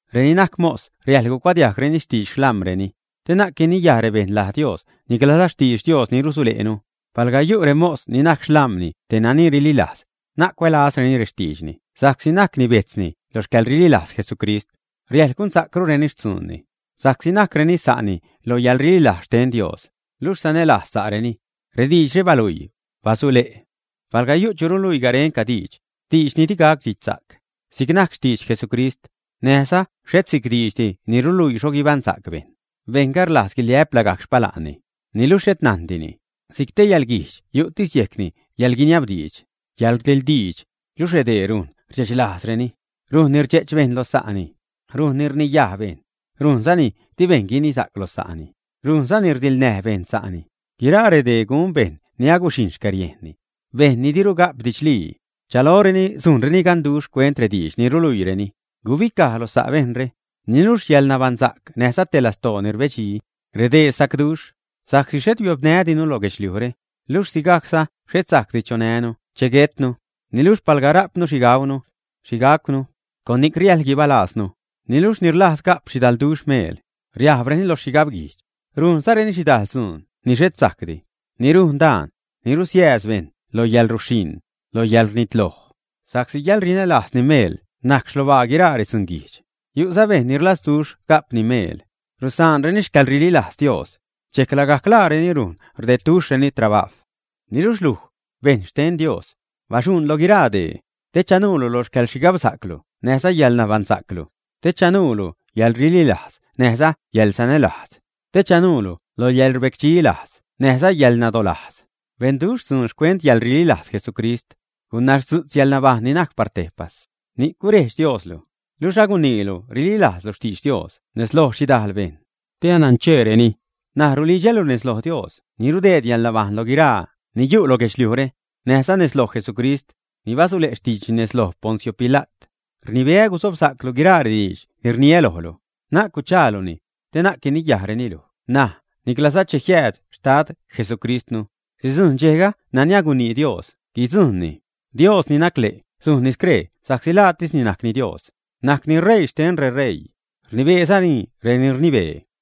Reni najc mos riäjḻ cuadiajgreni xtidx xlam̲reni, te na'c guiniyaj rebejṉ laj Dios niclaza xtidx Dios ni rusule'nu. Palga yu' remos ni najc xlam̲ni te nani rlilajz, na'c cuälazreni rextiidxni sa'csi najcni bejtzni lo xcäḻrililajz Jesucrist. Riäjḻ gunsa'crureni xtzuunni, sa'csi najcreni sa'ni loj yäḻrililajz xten Dios, luxh sanälajzzarenini. Rediidxre baluii, basule'. Palga yu' chu ruluii garenca diidx, diidx ni digac didxsa'c, si'c najc xtidx Jesucrist, näjza xhet si'c diidxdi ni ruluii xho guibaṉsa'c bejṉ, bejṉga rlajz guiliä'p lagajc xpala'nni, niluxh xhet najndini. Si'c te yäḻguijdx yu'tis yejcni yäḻguiniab diidx, yäḻrdiḻdiidx. Luxh redee rujn rdxe'ch lajzreni, rujnni rdxe'ch bejṉ lo sa'ni, rujnni rniyaj bejṉ, rujnzani di bejṉ guinisa'c lo sa'ni. Rujnzani rdiḻnäj bejṉ sa'ni. Guiraa redee gun bejṉ ni aguxhijṉ xcäriejnni, bejṉ ni diru ga'p didxlii. Rchaloreni sujnreni ganduxh xcuent rediidx ni ruluiireni. Gubicaj lo sa' bejṉre. Niluxh yäḻnabaṉsa'c näjza te lastoo ni rebedxi, redee sa'cduxh. Sa'csi xhet biopnädinu lo guedxliujre, luxh sigajcza xhet sajcdi chonänu che guetnu. Niluxh palga rajpnu xhi gaunu, xhi gajcwnu, con ni'c riäjḻ guibalaaznu. Niluxh reni rlajz ga'p xhidalduxh meel, riajbreni lo xhigab guijdx, rujnzareni xhidajl dzuun ni xhet sajcdi, ni rujn daan, ni rusiääz bejṉ lo yäḻruxhiṉ, lo yäḻrnitloj. Sa'csi yäḻrinälajzni meel najc xlobaa guiraa redzunguijdx. Yu'za bejṉ ni rlazduxh ga'pni meel, rusaanreni xcäḻrililajz Dios, dxejc lagajc laareni rujn rdedduxhreni trabajw. Niluxh luj, bejṉ xten Dios, baxu'ṉ lo guiraa dee, te chanuulu lo xcäḻxhigabsa'clu näjza yäḻnabaṉsa'clu; te chanajllu yäḻrililajz näjza yäḻsanälajz; te chanuulu lo yäḻrbecdxi lajz näjza yäḻnadolajz. Benduxh dzuun xcuent yäḻrililajz Jesucrist, gunazdzu'tz yäḻnabajṉ ni najc par tejpas. Ni'cni gurejdx Dioslu, luxh aguniilu rililajzlu xtidx Dios nez loj xhidajl bejṉ, te anancheereni. N̲aj rulidxälu nez loj Dios ni rudeed yäḻnabajṉ lo guiraa ni yu' lo guedxliujre, näjza nez loj Jesucrist, ni basule' xtiidxni nez lo Poncio Pila't, rnibeä guzobsa'clu guiraa rediidx ni rniä lojlu, na'c guchaaluni, te na'c guiniyajreni luj ṉaj niclaza cheni jiääd Xtad Jesucristnu. Sidzujṉ dxejga nani agunii Dios guidzujṉni. Dios ni najc le' sujn scree sa'csi laatisni najc Dios, najcni ṟeii xten reṟeii, rnibeezani reni rnibee.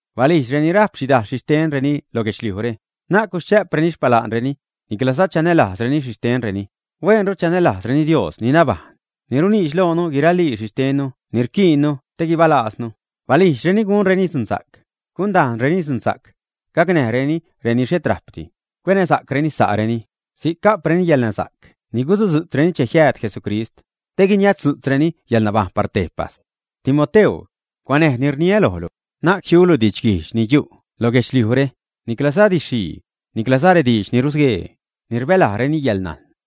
Balijdx reni rajp xhidajl xhixtenni lo guedxliujre, na'c guschä'preni xpala'nreni, niclaza chanälajzreni xhixtentisreni. Huenru chanälajzreni Dios ni nabajṉ, ni runiidx loonu guiralii xhixtennu ni rquiinnu te guibalajznu. Balijdxreni gunreni dzunsa'c, gundajnreni dzunsa'c, gacnäjreni reni xhet rajpdi, cuenäsa'creni sa'reni. Si'c ga'preni yälnasa'c ni guzudzu'tzreni che jiääd Jesucrist, te guiniaztzu'tzreni yäḻnabajṉ par tejpas. Timoteu, cuanäj ni rniä lojlu. Na'c jiulu didxguijdx ni yu' lo guedxliujre, niclaza didx-xhii, niclaza rediidx ni rusguee, ni rbälajreni 'yäḻnajn'.